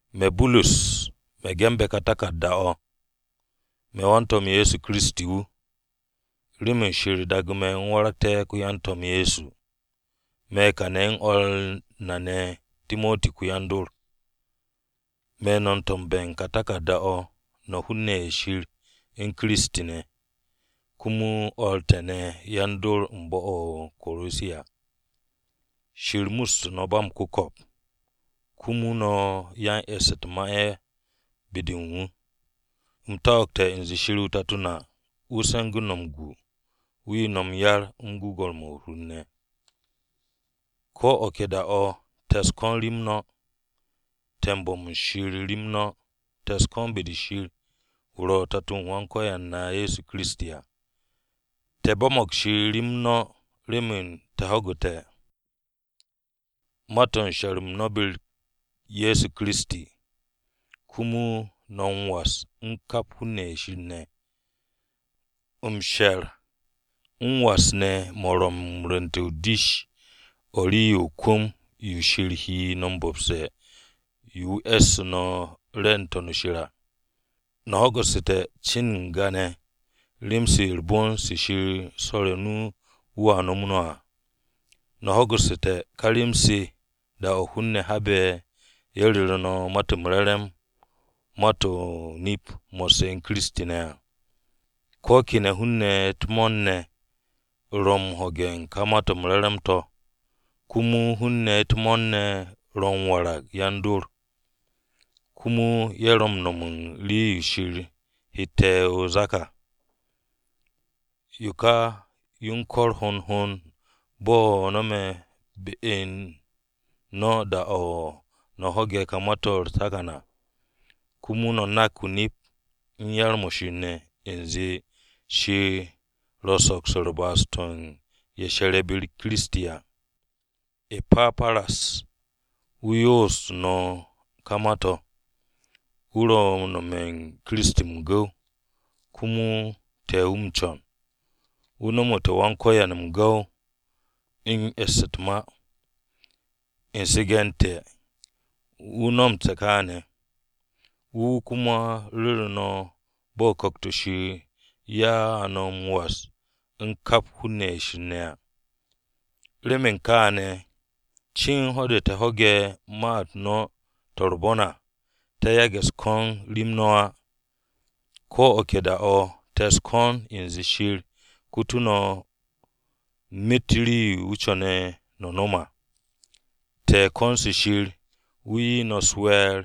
Me̱ Burus, me̱ ge̱nbe̱ ka taku̱rda-o̱. Me̱ wan-To̱m Ye̱soKiristi wu̱, remen Shir daagu̱ me̱ u̱m waragté̱ ko-yan-To̱m Ye̱so. Me̱ kane̱ u̱n o̱r na ne̱ Timoti ko-yan-dor. Me̱ no̱ m-to̱mbe̱ u̱n ka taku̱rda-o̱, no̱ hun-ne̱ ye̱ Shir u̱n Kiristi ne̱. Komo o̱r te̱ ne̱ yan-dor u̱n bo̱-o̱ o-Korosiya. Shir mustu̱ no̱ ba m-ku̱ko̱p, komo no̱ ro̱ yan-e̱ss u̱t-ma ye̱ be-de u̱n wu̱. U̱m ko̱no̱g u̱nze Shir o-Tato na wu̱ se̱ngu̱ no̱ m-gu, wu̱ 'ye no̱ m-yar u̱n gwu̱gwu̱-mo̱ u̱r-hur ne̱. Ko̱ o̱ ke da-o̱ te̱ u̱s-ko̱n rem no̱, te̱ u̱n bo̱m u̱n Shir rem no̱. Te̱ u̱s-ko̱n be-de Shir wu̱ ro̱ Tato-o Wan-Ko̱yan na Ye̱so Kiristi à. Te̱ bo̱mo̱g Shir rem no̱ remen te̱ ho̱gu̱te̱ ma-to̱ u̱n she̱r-m no̱ be-u̱r Ye̱so Kiristi, komo no̱ m-was u̱n kap hun-ne̱ ye̱ Shir ne̱. M-she̱r m-was ne̱ mo̱ ro̱ m-rwu̱nte̱ dish-o̱ u̱n rii-yo o-kwu̱m yo Shir he no̱ m-bo̱pse̱ yo wu̱ e̱ssu̱ no̱ re̱e̱ n-To̱n shir à. No̱ ho̱gu̱su̱te̱ cin n-ga ne̱ rem-se u̱r-bon se Shir swo̱re̱ o-nu wu̱a nomo no̱ à. No̱ ho̱gu̱su̱te̱ ka rem-se da-o̱ hun-ne̱ habe̱ ye̱ ru̱ru̱ no̱ Ma-to̱ m-Re̱re̱m ma-to̱ o-nip mo̱sse̱ u̱n Kiristi ne̱ à. Ko̱ kene̱ hun-ne̱ u̱t-mo̱o̱r ne̱ ro̱ m-ho̱ge̱ u̱n ka Ma-to̱ m-Re̱re̱m to̱, komo hun-ne̱ u̱t-mo̱o̱r ne̱ ro̱ m-warag u̱n yan-dor. Komo ye̱ ro̱ m-no̱m u̱n rii-yo Shir hette̱ o-zak à. Yo ka yo u̱n kor hond hond bo̱ no̱me̱ be u̱n no̱ da-o̱ no̱ ho̱ge̱ ka ma-to̱ u̱r-takan à. Komo no̱ nak o-nip u̱n yar-mo̱ Shir ne̱, u̱nze Shir ro̱ m-soks u̱n ba'as-to̱ u̱n ye̱ she̱re̱ be-u̱r Kiristi à. E̱paparas wu̱ yoosu̱ no̱ ka ma-to̱. Wu̱ ro̱ m-nome̱ u̱n Kiristi m-gu̱w, komo te̱ wu̱ m-co̱n. Wu̱ nomote̱ Wan-Ko̱yan m-gu̱w u̱n e̱ss u̱t-ma. U̱n su̱ge̱ u̱n te̱, wu̱ nomte̱ kaane̱. Wu̱ wu̱ komo ru̱ru̱ te̱ bo̱ Ku̱kt-o̱ Shir ya'u̱ no̱ m-was u̱n kap hun-ne̱ ye̱ Shir ne̱ à. Remen kaane̱ cin ho̱-de te̱ ho̱ge̱ ma-u̱t no̱ to̱ u̱r-bon à, te̱ yage̱ u̱s-ko̱n rem no̱ á. Ko̱ o̱ ke da-o̱ te̱ u̱s-ko̱n u̱nze Shir kutu̱ no̱ myet rii-yo wu̱ co̱ne̱ no̱ nom à. Te̱ u̱n ko̱n-se Shir wu̱ 'ye no̱ u̱s-we̱e̱r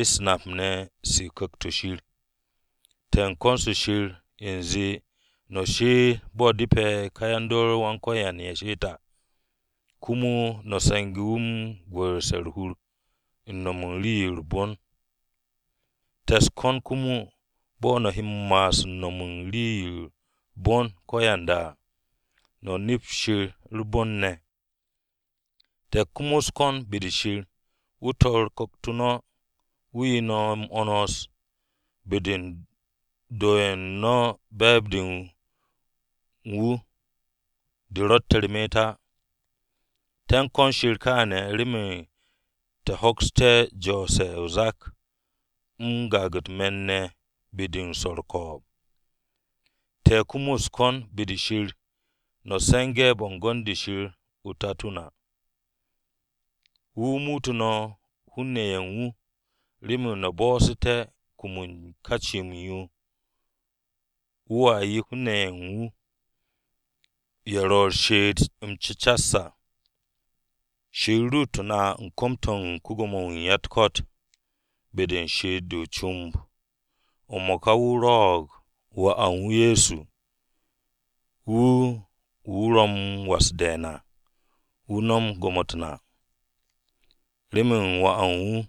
u̱s-nap ne̱ se u̱n Ku̱kt-o̱ Shir. Te̱ u̱n ko̱n-se Shir u̱nze no̱ she'et, bo̱ depe̱ ká ye̱ do̱re̱ Wan-Ko̱yan ye̱ she'et à. Komo no̱ se̱nge̱ wu̱ u̱n gwu̱'u̱rse̱ u̱r-hur u̱n nom u̱n rii-yo u̱r-bon ne̱. Te̱ u̱s-ko̱n komo bo̱ no̱ he m-ma'as u̱n no̱m u̱n bo̱ u̱n rii-yo u̱r-bon ko̱yanda à, no̱ nep Shir u̱r-bon ne̱. Te̱ komo u̱s-ko̱n be-de Shir wu̱ tor ku̱kt-o no̱ wu̱ 'ye no̱ m-'wo̱ns, be-de u̱n do ye̱ u̱n no̱ be̱e̱b-de u̱n wu̱ de ro̱tte̱ u̱r-me'et á. Te̱ u̱s-ko̱n Shir kaane̱ remen no̱ hoksté̱ m-jo̱o̱se̱ o-zak m-gaag u̱t-me̱n ne̱ be-de u̱n swo̱ u̱r-ko̱o̱b. Te̱ komo u̱s-ko̱n be-de Shir no̱ se̱nge̱ bo̱ngo̱n-de Shir Tato-o na. Wu̱ wu̱ muutu̱ no̱ hun-ne̱ ye̱ u̱n wu̱, remen no̱ bo̱'o̱sté̱ kum u̱n ka cim-yo wu̱a 'ye hun-ne̱ ye̱ u̱n wu̱, ye̱ ro̱ u̱r-she'et m-cecas à. Shir ruutu̱ na u̱n kom-to̱ u̱n ko-Gwo̱mo-wu̱ u̱n ya-u̱t-ko̱t, be-de u̱n she'et-de o-comb. M-mo̱ka wu̱ rwo̱'o̱g Wà u̱n wu̱ Ye̱so wu̱ wu̱ ro̱ m-was de̱e̱n à, wu̱ nom gwo̱mo-u̱t na. Remen Wà u̱n wu̱,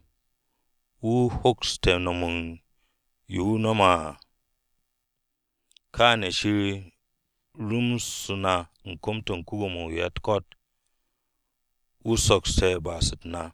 wu̱ hokste̱ no̱m u̱n yo wu̱ no̱me̱ à. Kaane̱ Shir rumsu̱ na u̱n kom-to̱ u̱n ko-Gwo̱mo-wu̱ u̱n ya-u̱t-ko̱t, wu̱ sokste̱ ba'as-u̱t na.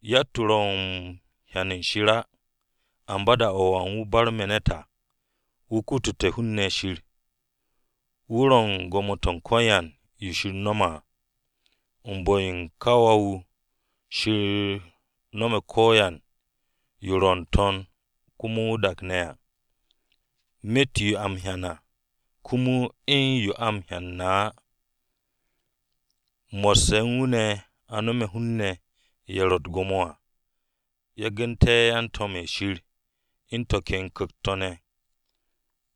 Yatt-wu̱ ro̱ m-hyan u̱n Shir á, amba da-o̱ Wà u̱n wu̱ barme̱ ne̱t à, wu̱ kutute̱ hun-ne̱ Shir. Wu̱ ro̱ u̱n gwo̱mo-to̱ u̱n ko̱yan yo Shir no̱me̱ à. U̱n bu̱-yo ka Wà-wu̱, Shir no̱me̱ ko̱yan yo ro̱ n-To̱n komo o-dak ne̱ à, myet yo a m-hyan ne̱ komo u̱n yo a m-hyane̱ ne̱ á. Mo̱sse̱ u̱n wu̱ ne̱ a no̱me̱ hun-ne̱ ye̱ ro̱ u̱t-gwo̱mo à. Yagu̱nte̱ yan-to̱m-ye̱ Shir u̱n to̱ ken ku̱kt-to̱ ne̱.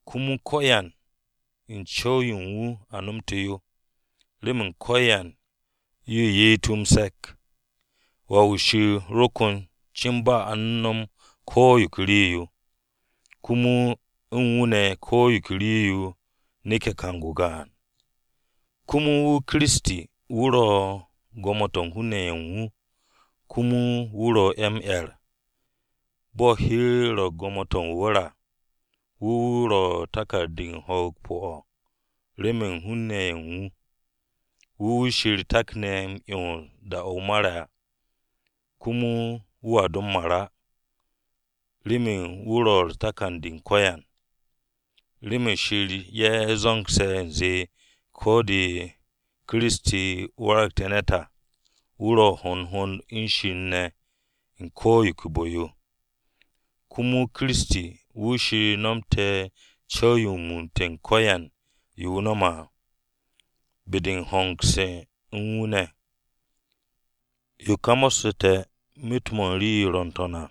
Komo ko̱yan u̱n co̱w-yo u̱n wu̱ a nomte̱ yo, remen ko̱yan yo ye'et wu̱ m-se̱k. Wà-wu̱ Shir ro ko̱n cin ba a u̱n no̱m ko̱ yo ke rii-yo, komo u̱n wu̱ ne̱ ko̱ yo ke rii-yo neke̱ kang-o gaan. Komo wu̱, Kiristi, wu̱ ro̱ u̱n gwo̱mo-to̱ u̱n hun-ne̱ ye̱ u̱n wu̱. Komo wu̱ ro̱ ye̱ m-'er. Bo̱ hi-u̱r ro̱ u̱n gwo̱mo-to̱ o-wu̱r à, wu̱ wu̱ ro̱ takan-de u̱n ho̱o̱g pu̱-o̱ remen hun-ne̱ ye̱ u̱n wu̱. Wu̱ wu̱ Shir takne̱ m-'yons da-o̱ wu̱ mare̱ à, komo wu̱a do m-mar á. Remen wu̱ ro̱ u̱r-takan u̱n ko̱yan. Remen Shir ye̱ zo̱ngse̱ u̱nze ko̱ de Kiristi waragte̱ ne̱t à, wu̱ ro̱ hond hond u̱n Shir ne̱ u̱n ko̱ yo ke bu̱-yo. Komo Kiristi wu̱ Shir nomte̱ co̱w-yo m-mu̱u̱nte̱ u̱n ko̱yan yo wu̱ no̱me̱ à, be-de m-hongse̱ u̱n wu̱ ne̱. Yo ka mo̱ssu̱te̱ myet-mo̱ u̱n rii-yo ro̱ n-To̱n à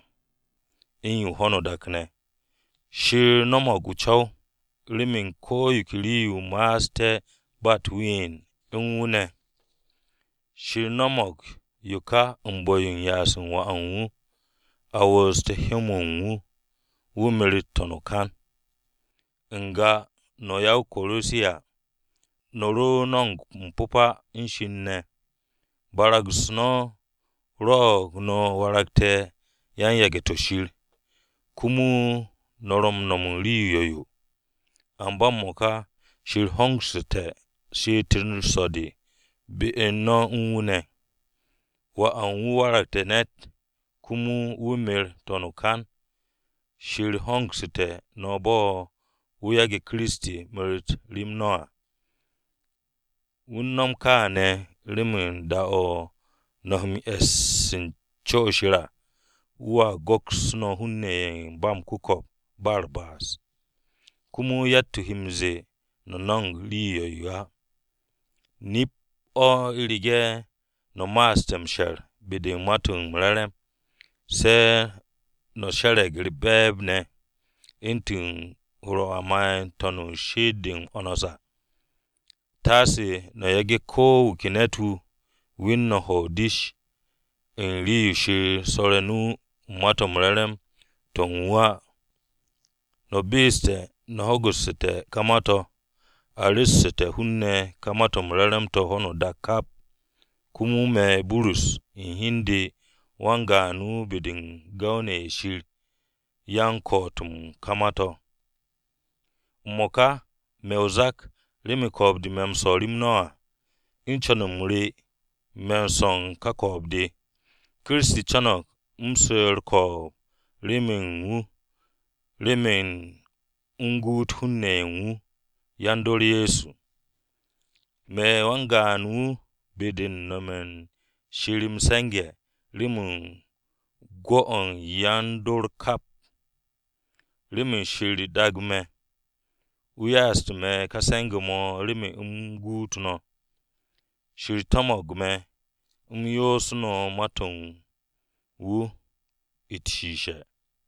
u̱n ho̱no o-dak ne̱. Shir no̱mo̱g o-co̱w remen ko̱ yo ke rii-yo ma'aste̱ ba u̱t-ween u̱n wu̱ ne̱. Shir no̱mo̱g yo ka u̱n bu̱-yo u̱n ya'as u̱n Wà u̱n wu̱, a wu̱u̱ste̱ hyó-mo̱ u̱n wu̱, wu̱ meret n-to̱n o-kan. N-ga no̱ ya-o-Korosiya, no̱ ro no̱mo̱g m-pu̱pa u̱n Shir ne̱. Barag-u̱s no̱ rwo̱'o̱g no̱ waragte̱ yan-yage̱-to̱ Shir, komo no̱ ro m-nom u̱n rii yo̱-yo. Amba m-mo̱ka, Shir hongsu̱te̱ she'et-u̱r so̱-de be-u̱r no̱ u̱n wu̱ ne̱. Wà u̱n wu̱ waragte̱ ne̱t komo wu̱ mer n-to̱n o-kan. Shir hongsu̱te̱ no̱ bo̱ wu̱ yage̱ Kiristi meret rem no̱ à. Wu̱ u̱n no̱m kaane̱ remen da-o̱ no̱ he m-e̱s u̱n co-o̱ Shir à wu̱a go̱ks no̱ hun-ne̱ ye̱ ba m-ku̱ko̱p ba u̱r-ba'as. Komo yatt-wu̱ he m-ze̱e̱ no̱ no̱mo̱g rii yo̱-yo á. Nip-o̱ u̱rege̱ no̱ ma'aste̱ m-she̱r be-de u̱n Ma-to̱ m-Re̱re̱m. Se̱ no̱ she̱re̱g u̱r-be̱e̱b ne̱ u̱ntu̱n hur-o̱ a ma'e̱ n-to̱n u̱n shi'it-de m-'wo̱ns à. Taase no̱ yage̱ ko̱ wu̱ ke ne̱t-wu̱ we̱n no̱ hwo̱ o-dish u̱n rii-yo Shir swo̱re̱ o-nu u̱n Ma-to̱ m-Re̱re̱m to̱ u̱n wu̱ à. No̱ be'esu̱te̱ no̱ ho̱gu̱ssu̱te̱ ka ma-to̱. A ru̱ssu̱te̱ hun-ne̱ ka Ma-to̱ m-Re̱re̱m to̱ ho̱no o-dak kap. Komo me̱ Burus u̱n hi u̱n de wan-gaan wu̱ be-de u̱n gu̱w-ne̱ ye̱ Shir ya m-ko̱'o̱t u̱n ka ma-to̱. M-mo̱ka, me̱ o-zak remen ko̱o̱b-de me̱ m-swo̱ rem no̱ à. U̱n co̱n-m re, me̱n swo̱o̱n ka ko̱o̱b-de. Kiristi co̱no̱g u̱m su̱ u̱r-ko̱o̱b remen u̱n wu̱ remen u̱m guut hun-ne̱ ye̱ u̱n wu̱, yan-dor Ye̱so. Me̱ wan-gaan wu̱ be-de u̱n nome̱ u̱n Shir m-se̱nge̱ remen gwu̱-o̱ yan-dor kap. Remen Shir u̱n daag me̱, wu̱ ya'astu̱ me̱ ka se̱nge̱-mo̱ remen u̱m guut no̱. Shir to̱mo̱g me̱ u̱m yoosu̱ no̱ ma-to̱ u̱n wu̱ u̱t-shishe̱.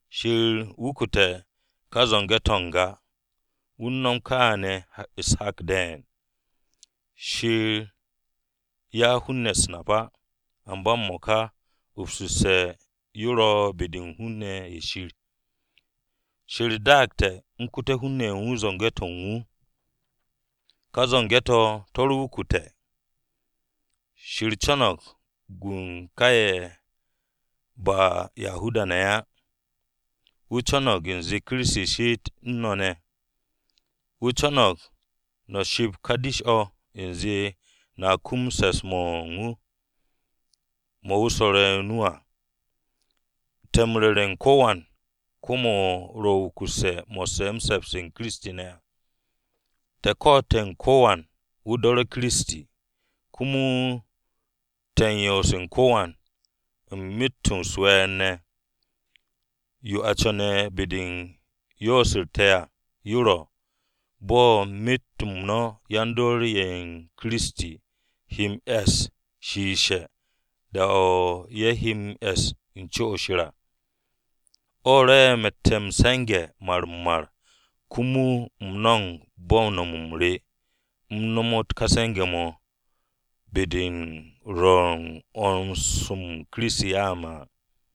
Shir wukute̱ kà zo̱nge̱-to̱ n-ga, wu̱ u̱n no̱m kaane̱ u̱s-hak de̱e̱n. Shir 'ya hun-ne̱ u̱s-nap á, amba m-mo̱ka upsu̱sse̱ yo ro̱ be-de u̱n hun-ne̱ ye̱ Shir. Shir daagte̱ m-kute̱ hun-ne̱ u̱n wu̱ zo̱nge̱-to̱ u̱n wu̱. Ká zo̱nge̱-to̱ to̱ ro wukute̱. Shir co̱no̱g m-gu ka ye̱ ba Yahuda-ne̱ á. Wu̱ co̱no̱g u̱nze Kiristi she'et u̱n no̱ ne̱. Wu̱ co̱no̱g no̱ ships ká dish-o̱ u̱nze no̱a kum se̱ps-mo̱ u̱n wu̱, mo̱ wu̱ swo̱re̱ o-nu à. Te̱ m-ru̱re̱ u̱n ko̱wan kwu̱m-o̱ ro̱ wukusse̱ mo̱sse̱ se̱ps-m Kiristi ne̱ à. Te̱ ko̱'o̱te̱ u̱n ko̱wan wu̱ do̱re̱ Kiristi. Komo te̱ u̱n yoose̱ u̱n ko̱wan u̱n myet-o̱ u̱s-we̱e̱r ne̱. Yo a co̱ne̱ be-de u̱n yoos-u̱r te̱ à yo ro̱, bo̱ myet-mo̱ u̱n yan-dor ye̱ u̱n Kiristi he m-e̱s shiishe̱ da-o̱ ye̱ he m-e̱s u̱n co-o̱ Shir à. O̱ rwo̱'e̱ me̱tte̱ m-se̱nge̱ mar-m-mar. Komo u̱m no̱mo̱g bo̱ u̱n no̱m-m re u̱m nomot ka se̱nge̱-mo̱ be-de u̱n rwo̱ u̱n 'wo̱ns-mo̱ Kiristi ya'u̱ me̱ à.